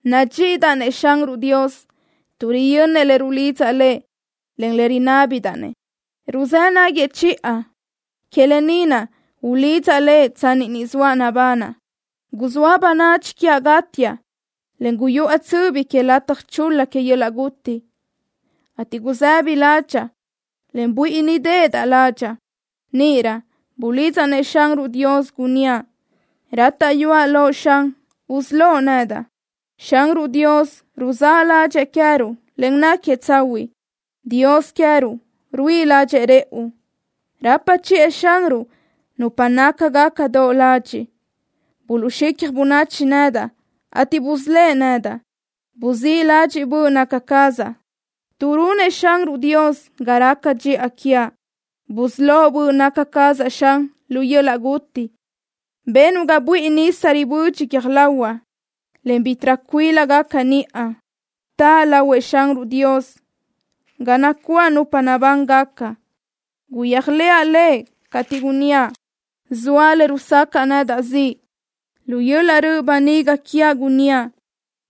Nadxíʼidaʼ-nëʼ Xanruʼ Dios, tuʼ riyönnëʼ le rulidzaʼ Lëʼ, en le rinábidaʼ-nëʼ. Ruzë́ naguëʼ chiʼa. Que lë ni naʼ ulidzaʼ Lëʼ tsanni ni zoaʼ nabanaʼ. Guzóa bönadxi quiaʼ gátiaʼ, en guyuʼa tsöbi que lataj chul-la que yöl-laʼ guti, ateʼ gusëbi ládxaʼa, en buíʼinideʼedaʼ ládxaʼa. Níʼirö bulidzaʼ-nëʼ Xanruʼ Dios, gunníaʼ: “Rátaʼyuaʼ loʼ, Xan, usölóʼ nedaʼ.” Xanruʼ Dios ruzáʼ ládxëʼë queë́ruʼ, en náquiëʼ tsahuiʼ. Dios queë́ruʼ ruíʼi ládxëʼë rëʼu. Rapa chiʼë Xanruʼ nupa nácagaca doʼ ladxiʼ. Buluʼxicja bönachi nedaʼ, ateʼ busölë́ʼ nedaʼ. Buzíʼ ladxiʼ böʼ naca cazaʼ, tuʼ runëʼ Xanruʼ Dios ga raca dxiʼa quiaʼ. Busölóʼ böʼ naca cazaʼ, Xan, lu yöl-laʼ guti. Benuʼ ga buíʼi nisa ribödxi guiö́j lahuaʼ, en ga bítiʼrö cuílagaca niʼa. Taʼa lahuëʼ Xanruʼ Dios ga nacuáʼ nupa nabángaca. Guyéajlëʼa Lëʼ cateʼ gunníaʼ: “Zoa le rusacaʼ nedaʼ ziʼ.” Lu yöl-laʼ röʼ böniga quiaʼ gunníaʼ: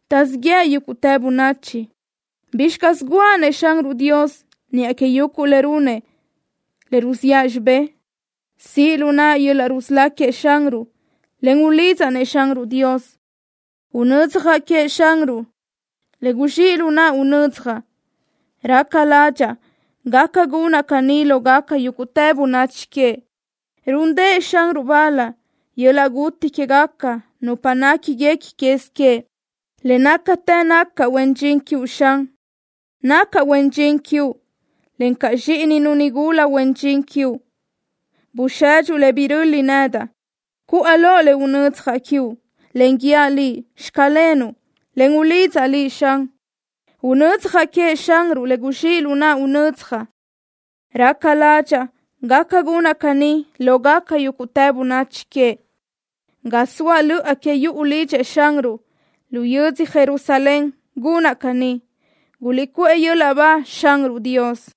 “Taʼzíʼ yëʼ yúguʼtë bönachi.” ¿Bizxi caz guʼa-nëʼ Xanruʼ Dios niʼa que yuguʼ le runëʼ le ruziʼa xibé? Siʼ lu naʼa yöl-laʼ rusölá queëʼ Xanruʼ, en ulidzaʼ-nëʼ Xanruʼ Dios. Unödzjaʼ queëʼ Xanruʼ le guzxíʼ lu naʼa unödzjaʼ. Raca ládxaʼa gaca gunaʼ caní lógaca yúguʼtë bönachi queëʼ. Rúndëʼë Xanruʼ bal yöl-laʼ guti quégaca nupa néquiguequi quez queëʼ. Le nácatë nacaʼ huen dxin quiuʼ, Xan. Nacaʼ huen dxin quiuʼ, encaʼ zxíʼininu nigula huen dxin quiuʼ. Busedxuʼ le biröli nedaʼ. Cuʼa loʼ le unödzjaʼ quiuʼ, en guíaʼ Liʼ: “Xclenuʼ”, en ulidzaʼ Liʼ, Xan. Unödzjaʼ queëʼ Xanruʼ le guzxíʼ lu naʼa unödzjaʼ. Raca ládxaʼa gaca gunaʼ caní lógaca yúguʼtë bönachi queëʼ. Ga zoa löʼa que yuʼu lidxëʼ Xanruʼ, lu yödzö Jerusalén gunaʼ caní. ¡Guliʼcuʼë yöl-laʼ ba Xanruʼ Dios!